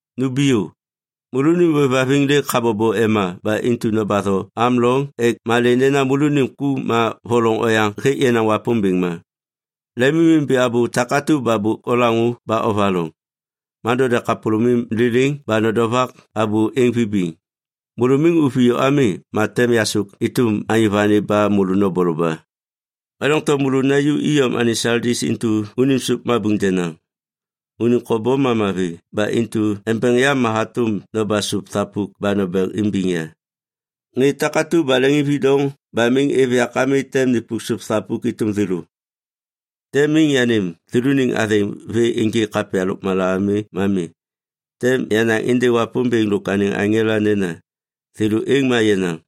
Numbiyô! Môlônim ôêvhaviŋ lêk habobo ema ba intu nobatho am loŋ ek malê nena môlônim ku ma voloŋ oyaŋ hêk yenaŋ Wapômbêŋ ma. Lemimimbi abô takatu ba bôk olaŋô ba ovaloŋ. Ma node kapôlômim liliŋ ba nodovak abô êŋ vibiŋ. Môlô miŋ oviyô ami, ma tem yasôk êtôm anyô vani ba môlô noboloba. Ma doŋtom môlô naju iyom anêŋ Saldis intu unim sôp mabuŋ denaŋ. Unim kobom ma mavi ba intu embeŋ yam ma hatôm noba sôp thapuk ba nombeŋ imbiŋ ya. Ŋê takatu ba leŋiŋvidoŋ ba miŋ êv yak ami tem nipuk sôp thapuk êtôm thêlô. Tem miŋ yanêm thêlôniŋ athêŋ vê ênjêk kapya lôkmala ami ma mi. Tem yanaŋ êndêŋ Wapômbêŋ lôk anêŋ aŋela nena, ‘Thêlô êŋ ma yenaŋ.’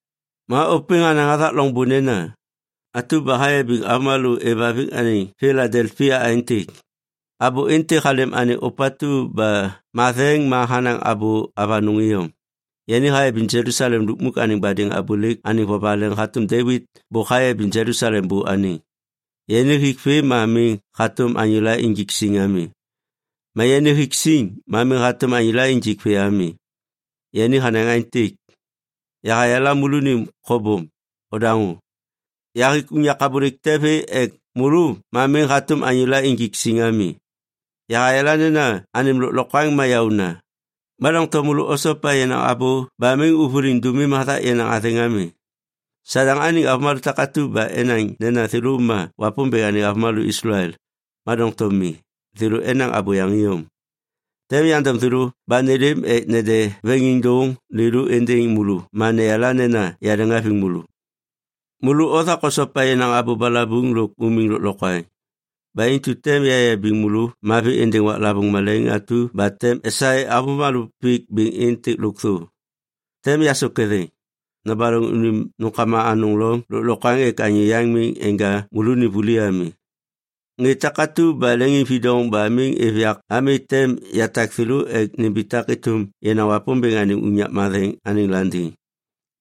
Ma ôpêŋ hanaŋ hathak loŋbô nena, “Oto abô ni êndêŋ aŋela atu ba hayabiŋ avômalô êvhaviŋ anêŋ Piladelpia aêntêk: Abô êntêk halêm anêŋ ôpatu ba matheŋ ma hanaŋ abô avanôŋ iyom. Yani hayabiŋ Jelusalem lukmuk anêŋ badêŋ abôlêk anêŋ vovaleŋ hatôm Devit bôk hayabiŋ Jelusalem bô anêŋ. Yani hik vê ma miŋ hatôm anyôla injik siŋ ami. Ma yani hik siŋ ma miŋ hatôm anyôla injik vê ami. Yani hanaŋ aêntêk: Yahayala môlônim kobom. Odaŋô. Yahik unyak abôlêk te vê ek môlô ma miŋ hatôm anyôla injik siŋ ami. Yahayala nena anêm lôklokwaŋ ma yaôna, ma doŋtom môlô osopa yenaŋ abô ba miŋ ôvôliŋ dômim hathak yenaŋ athêŋ ami. Sadaŋ anêŋ avômalô takatu ba enaŋ nena thêlô ma Wapômbêŋ anêŋ avômalô Islael, ma doŋtom mi, thêlô enaŋ abôyaŋ iyom. Tem yandom thêlô ba nêlêm ek nede veŋiŋdôŋ lêlô êndêŋ môlô ma neyala nena yaleŋhaviŋ môlô. Môlô othak osopa yenaŋ abô balabuŋ lôk umiŋ lôklokwaŋ. Ba intu tem yayabiŋ môlô mavi êndêŋ waklavôŋ malaiŋ atu ba tem esaê avômalô pik bêŋ êntêk lôkthô. Tem yasôk ketheŋ. Nobaloŋ unim nômkama anôŋ loŋ lôklokwaŋ ek anyô yaŋ miŋ enja môlônim vuli ami. Ŋê takatu ba leŋiŋvidoŋ ba miŋ êv yak ami tem yatak thêlô ek nimbitak êtôm yenaŋ Wapômbêŋ anêŋ unyak matheŋ anêŋ landiŋ.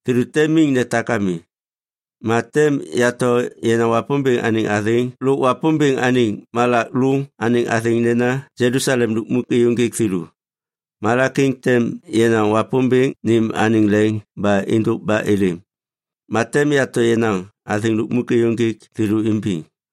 Thêlô tem miŋ netak ami. Ma tem yato yenaŋ Wapômbêŋ anêŋ athêŋ lôk Wapômbêŋ anêŋ malak lôŋ anêŋ athêŋ nena Jelusalem lukmuk êyôŋgêk thêlô. Malak êŋ tem yenaŋ Wapômbêŋ nêm anêŋ leŋ ba êndôk ba êlêm. Ma tem yato yenaŋ athêŋ lukmuk êyôŋgêk thêlô imbiŋ.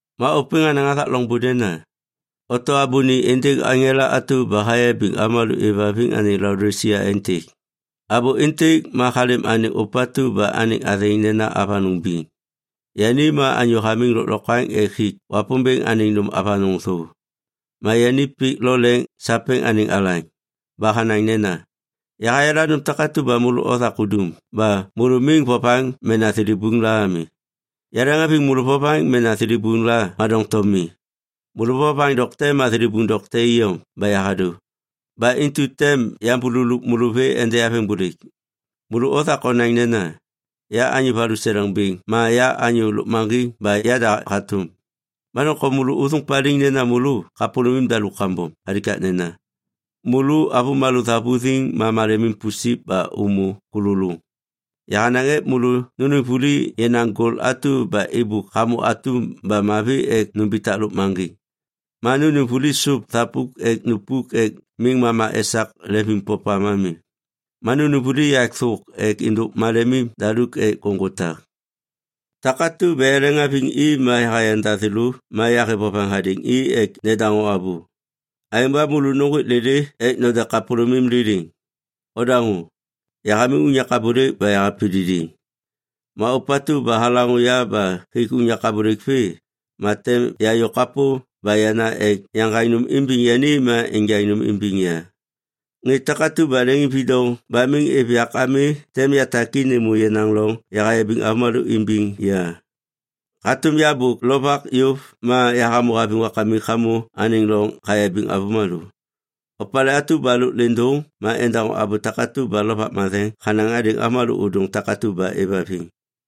Ma ôpêŋ hanaŋ hathak loŋbô nena, “Oto abô ni êndêŋ aŋela atu ba hayabiŋ avômalô êvhaviŋ anêŋ Laodisia aêntêk: Abô êntêk ma halêm anêŋ ôpatu ba anêŋ athêŋ nena Avanôŋ Biŋ. Yani ma anyô hamiŋ lôklokwaŋ ek hik Wapômbêŋ anêŋ nôm avanôŋ thô. Ma yani pik lo leŋ sapêŋ anêŋ alaŋ. Ba hanaŋ nena: Yahayala nôm takatu ba môlô othak udum ba môlô miŋ vovaŋ mena thilibuŋ la ami. Yaleŋhaviŋ môlô vovaŋ mena thilibuŋ la ma doŋtom mi. Môlô vovaŋ dokte ma thilibuŋ dokte iyom ba yahadô. Ba intu tem yambululup môlô vê ende yaveŋbôlêk. Môlô othak onaŋ nena, ‘Ya anyô valuseleŋ bêŋ ma ya anyô lôkmaŋgiŋ ba yada hatôm.’ Ma doŋtom môlô ôthôŋ paliŋ nena môlô kapôlômim daluk kambom! Alikaknena, môlô avômalô thavuthiŋ ma malemim pusip ba ômô kôlôlôŋ. Yahanaŋ ek môlô nônêm vuli yenaŋ gol atu ba êbôk hamô atum ba mavi ek numbitak lôkmaŋgiŋ. Ma nônêm vuli sôp thapuk ek nupuk ek miŋ mama esak lemvimpopam ami. Ma nônêm vuli yak thôk ek êndôk malemim daluk ek ôŋgô tak. Takatu ba yaleŋhaviŋ i ma yahayanda thêlô ma yahêv vovaŋ hadêŋ i ek nedaŋô abô. Aêŋ ba môlô nôŋgwêk lêlê ek node kapôlômim liliŋ. Odaŋô. Yahamiŋ unyak abôlêk ba yahapididiŋ. Ma ôpatu ba halaŋô ya ba hik unyak abôlêk vê, ma tem yayô kapô ba yana ek yaŋgaŋ nôm imbiŋ yani ma enjaŋ nôm imbiŋ ya. Ŋê takatu ba leŋiŋvidoŋ ba miŋ êv yak ami tem yatak i nêmô yenaŋ loŋ yahayabiŋ avômalô imbiŋ ya, hatôm ya bôk lovak yôv ma yahamô haviŋ Wakamik hamô anêŋ loŋ hayabiŋ avômalô. Opalê atu ba lôk lêndôŋ ma endaŋô abô takatu ba Lovak Matheŋ hanaŋ hadêŋ avômalô ôdôŋ takatu ba êvhaviŋ.”